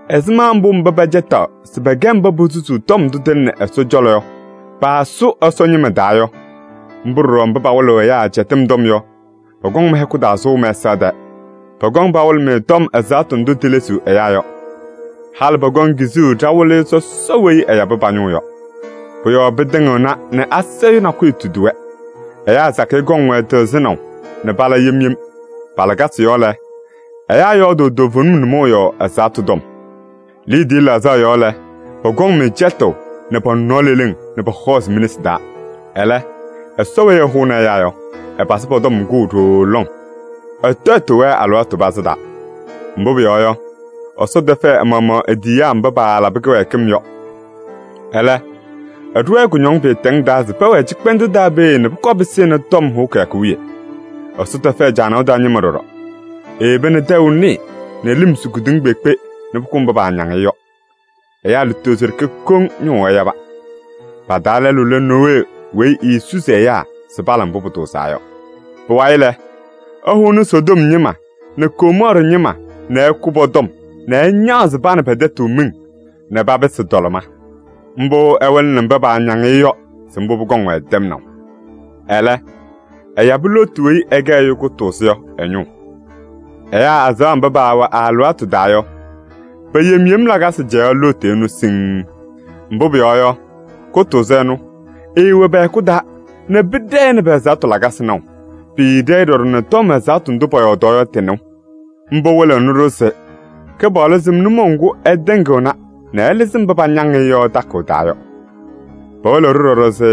Ɛzɩma mbʋ mba pɛcɛtaɣ se pɛkɛ mba posusuu tɔm ndʋ tɩlɩnɩ Ɛsɔ cɔlɔ yɔ paasʋ Ɛsɔ ñɩma taa yɔ, mbʋ ɖɔɖɔ mba pawɩlɩɣ ɛyaa cɛtɩm tɔm yɔ pɔkɔŋ mɩ-hɛkʋ taa sʋʋ mɛsaɣ tɛɛ. Pɔkɔŋ pawɩlɩ-mɩ tɔm ɛzaɣtʋ ndʋ tilesiɣ ɛyaa yɔ. Halɩ pɔkɔŋ kizuu ɖa-Wɩlɩyʋ sɔsɔ weyi ɛyabɩ pa-ñʋʋ yɔ. Pʋ-yɔɔ pɩtɩŋɩɣna nɛ asayʋʋ nakʋyʋ tudi-wɛ. Ɛyaa sakɩyɛ kɔŋ-wɛ tɩɣzɩnaʋ nɛ pala yem yem. Pa-lakasɩ yɔɔ lɛ, ɛyaa yɔɔdʋʋ toovenim nʋmɔʋ yɔɔ ɛzaɣtʋ tɔm. Liidiye laɣzaɣ yɔɔ lɛ, pɔkɔŋ-mɩ cɛtʋʋ nɛ pɔ-nɔɔ leleŋ nɛ pɔhɔɔzɩ mi-nesi taa. Ɛlɛ, Ɛsɔ weyi ɛhʋʋnɩ ɛyaa yɔ, ɛpazɩ pɔ-tɔm kʋʋ ɖooo lɔŋ. Ɛtɔyɩtʋʋ-wɛ alɩwaatʋ pazɩ taa. Mbʋ pʋyɔɔ yɔ, Ɛsɔ tɛfɛɛ ɛ-maɣmaɣ e-tiyiyaa mba paalabɩ kɩwɛɛkɩm yɔ. Ɛlɛ, ɛɖʋ-wɛ kʋñɔŋ pɩɩtɛŋ taa se pɛwɛɛ cɩkpɛndʋʋ taa peeye nɛ pʋkɔɔ pɩsɩnɩ tɔm hʋʋ kɩyakʋ wiye. Ɛsɔ tɛfɛɛ caanaʋ taa ñɩma ɖɔɖɔ: eyeba nɛ tɛʋ nɩɩ nɛ lɩm su kedeŋa kpeekpe nɛ pʋkʋ mba paañaŋ-ɩ yɔ. Ɛyaa lutozo ɖeke koŋ ñʋʋ ɛyaba. Pa-taa lɛlʋ lɛ Nowee weyi eesusi ɛyaa se pala mbʋ pʋtʋʋzaa yɔ. Pʋwayɩ lɛ, ɛhʋnɩ Sodom ñɩma nɛ Gomɔɔrɩ ñɩma nɛ ɛkʋ pɔ-tɔm nɛ ɛñaɣzɩ pa nɛ pɛ-tɛtʋ miŋ nɛ papɩsɩ tɔlɩma. Mbʋ ɛwɩlɩnɩ mba paañaŋ-ɩ yɔ se mbʋ pʋkɔŋ-wɛ tɛmnaʋ. Ɛlɛ, ɛyabɩ Looti weyi ɛkɛ ɛyʋ kʋtʋʋzʋ yɔ ɛ-ñʋʋ. Ɛyaa azaɣa mba paawɛ ɛ-alɩwaatʋ taa yɔ, pe-yem yem lakasɩ cɛyaɣ Looti ɛnʋ siŋŋ. Mbʋ pʋyɔɔ yɔ, kʋtʋʋzʋ ɛnʋ, ɛɛwɛ pɛ-hɛkʋ taa nɛ pɩɖɛɛ-ɩ nɛ pɛ-ɛzaɣtʋ lakasɩ naʋ. Pɩɩɖɛ-ɩ ɖɔɖɔ nɛ tɔm ɛzaɣtʋ ndʋ pɔyɔɔdaɣ yɔ tɩ-nɩʋ. Mbʋ wɩlɩɣnɩ-ɖʋ se Kɩpaɣlʋ sɩm nʋmɔʋ ŋgʋ ɛtɩŋɩɣna nɛ ɛlɩzɩ mba pañaŋ-ɩ yɔ takʋʋ taa yɔ. Pɩwɩlɩɣ-ɖʋ ɖɔɖɔ se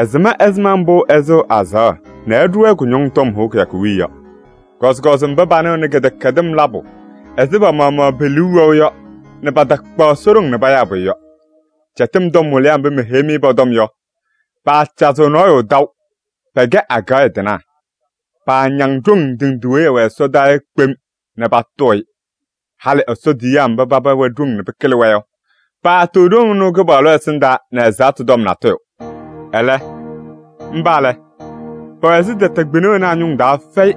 ɛsɩm ɛzɩma mbʋ ɛsɩɣ azaɣa nɛ ɛɖʋ-wɛ kʋñɔŋ tɔm hʋʋ kɩyakʋ wiye yɔ. Kɔzɩkɔzɩ mba panɩɣnɩ kɩdɛkɛdɩm labʋ ɛzɩ pa-maɣmaɣ pe-liu wɛʋ yɔ nɛ patakpaɣ Ɛsɔ ɖoŋ payaa pʋyʋ yɔ. Cɛtɩm tɔm wɩlɩyaa mba meheyi-mɩ pɔ-tɔm yɔ, paacazɩɣ nɔɔyʋ taʋ, pɛkɛ agaɣya tɩnaa. Paañaŋ ɖoŋ ndɩ ndɩ weyi ɩwɛ ɛsɔdaa yɔ kpem nɛ patʋʋ-ɩ. Halɩ Ɛsɔ tiyiyaa mba paba wɛ ɖoŋ nɛ pɩkɩlɩ-wɛ yɔ, paatʋʋ ɖoŋ ɩnʋ Kɩpaɣlʋ ɛsɩndaa nɛ ɛzaɣtʋ tɔm natʋyʋ. Ɛlɛ, mba lɛ, pɛwɛ ɛzɩ tɛtɛ kpɩna wena a-ñʋŋ taa fɛyɩ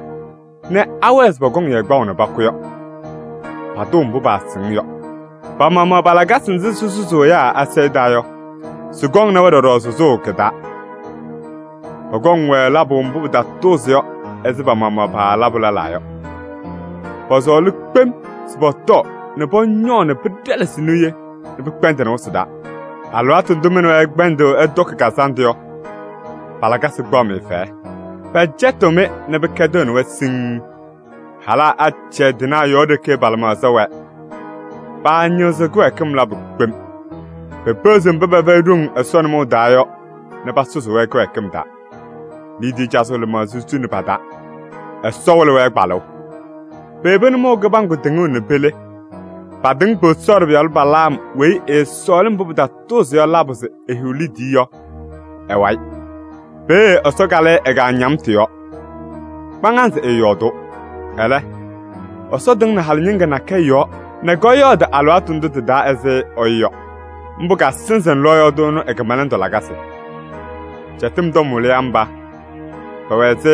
nɛ awɛɛ se pɔkɔŋ-yɛ kpaʋ nɛ pakʋ yɔ. Patʋʋ mbʋ paasɩŋ yɔ. Pa-maɣmaɣ pa-lakasɩ nzɩ sɩsʋzʋʋ ɛyaa asayʋʋ taa yɔ, sɩkɔŋnɩ-wɛ ɖɔɖɔ sʋzʋʋ kɩ-taa. Pɔkɔŋ-wɛ labʋ mbʋ pɩtatʋʋzɩ yɔ ɛzɩ pa-maɣmaɣ palabʋ lɛlaa yɔ. Pɔsɔɔlɩ kpem se pɔtɔɔ nɛ pɔñɔɔ nɛ pɩɖɛlɛsɩ niye nɛ pɩkpɛndɩnɩ wɩsɩ taa. Alɩwaatʋ ndʋ mɩ nɛ wɛ ɩkpɛndɩɣ ɩtɔkɩ kazandʋ yɔ, pa-lakasɩ kpaɣ-mɩ fɛyɛ. Pɛcɛtɩɣ-mɩ nɛ pɩkɛdɩɣnɩ-wɛ siŋŋ. Halaa acɛyɛ tɩnaa yɔɔ ɖeke pa-lɩmaɣza wɛɛ. Paañɩɣzɩɣ kɩwɛɛkɩm labʋ kpem. Pepeɣziɣ mba pɛfɛyɩ ɖoŋ Ɛsɔ nʋmɔʋ taa yɔ nɛ pasʋzʋʋ-wɛ kɩwɛɛkɩm taa. Liidiye cazʋʋ lɩmaɣza suni pa-taa. Ɛsɔ wɩlɩ-wɛ kpalʋʋ. Peyebi nʋmɔʋ kɩbaŋgʋ tɩŋʋʋ nɛ pele. Patɩŋ Bosɔɔrɩ pɩyalʋ Balaam weyi ɛɛsɔɔlɩ mbʋ pɩtatʋʋzɩ yɔ labʋ se ehiɣ liidiye yɔ ɛ-wayɩ. Peeye Ɛsɔ kalɩ-ɩ ɛ-kaañamtʋ yɔɔ. Kpaŋazɩ ɛɛyɔɔdʋʋ. Ɛlɛ, Ɛsɔ tɩŋnɩ halɩ ñɩŋga nakɛyɛ yɔɔ nɛ kɔyɔɔdɩ alɩwaatʋ ndʋ tɩ-taa ɛzɩ ɛyʋ yɔ. Mbʋ kasɩzɩnɩ lɔɔyaɣ tʋ ɛnʋ ɛ-kɩmɛlɛndʋ lakasɩ. Cɛtɩm tɔm wɩlɩyaa mba, pɛwɛ ɛzɩ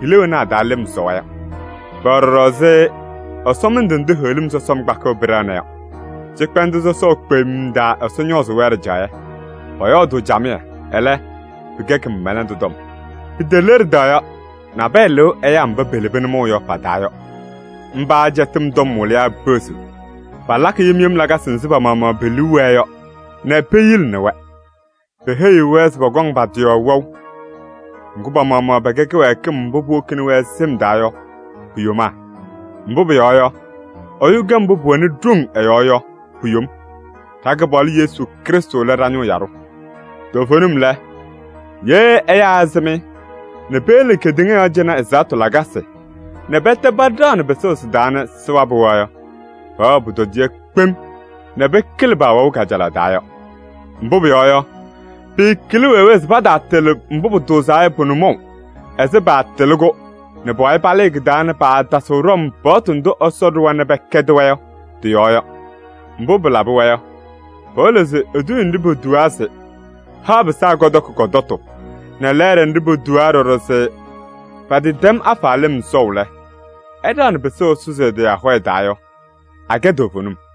hila wena a-taa lɩm sɔwa yɔ. Pɛwɛ ɖɔɖɔ ɛzɩ ɛsɔmɩndʋ ndʋ heɣlim sɔsɔm kpakɩɣ pɩɖɛɣna yɔ. Cɩkpɛndʋʋ sɔsɔʋ kpemm taa Ɛsɔ ñɔɔzʋʋ-wɛ ɖɩjaɣyɛ. Pɔyɔɔdʋʋ camɩyɛ, ɛlɛ pɩkɛ kɩmɛlɛndʋ tɔm. Piteleɖida yɔ, nabɛyɛ lɩʋ ɛyaa mba pelebi nʋmɔʋ yɔ pa-taa yɔ. Mba cɛtɩm tɔm wɩlɩyaa peɣziɣ. Palakɩ yem yem lakasɩ nzɩ pa-maɣmaɣ pe-liu wɛɛ yɔ nɛ peyilini-wɛ. Peheyiɣ-wɛ se pɔkɔŋ pa-tɩ yɔɔ wɛʋ. Ŋgʋ, pa-maɣmaɣ pɛkɛ kɩwɛɛkɩm mbʋ puwokini-wɛ sɩm taa yɔ pu-yomaa. Mbʋ pʋyɔɔ yɔ, ɛyʋ kɛ mbʋ pʋwɛnɩ ɖoŋ ɛ-yɔɔ yɔ pu-yom. Ɖa-Kɩpaɣlʋ Yesu Krɩstʋ lɛ ɖa-ñʋʋ yaɖʋ. Toovenim lɛ, ye ɛyaa ɛsɩm-ɩ nɛ peyele kedeŋa yɔɔ cɩnɛ ɛzaɣtʋ lakasɩ nɛ pɛtɛ paɖaɣnɩ pɩsʋʋ sɩ-taa nɛ sɩwabɩ-wɛ yɔ, pɛwɛɣ pʋtɔdɩyɛ kpem nɛ pɩkɩlɩ paawɛʋ kajalaɣ taa yɔ. Mbʋ pʋyɔɔ yɔ, pɩɩkɩlɩ wee wee se pataatɩlɩ mbʋ pʋtʋʋzaa yɔ pʋ-nʋmɔʋ ɛzɩ paatɩlɩ-kʋ nɛ pʋwayɩ palɩɩ kɩ-taa nɛ paatasɩɣ ɖɔm paɣtʋ ndʋ Ɛsɔ ɖʋwa nɛ pɛkɛdɩ-wɛ yɔ tɩ-yɔɔ yɔ. Mbʋ pɩlabɩ-wɛ yɔ, pɩwɩlɩɣ se eduuye nɖɩ potuwaa se: “Haɣ pɩsaa kɔtɔkɩ kɔ-tɔtʋ” nɛ lɛɛɖɛ nɖɩ potuwaa ɖɔɖɔ se: “Patɩtɛm afa lɩm sɔʋ lɛ, ɛɖaɣnɩ pɩsʋʋ ɛsʋzɩ ɛ-tɩ ahɔya taa” yɔ, akɛ toovenim.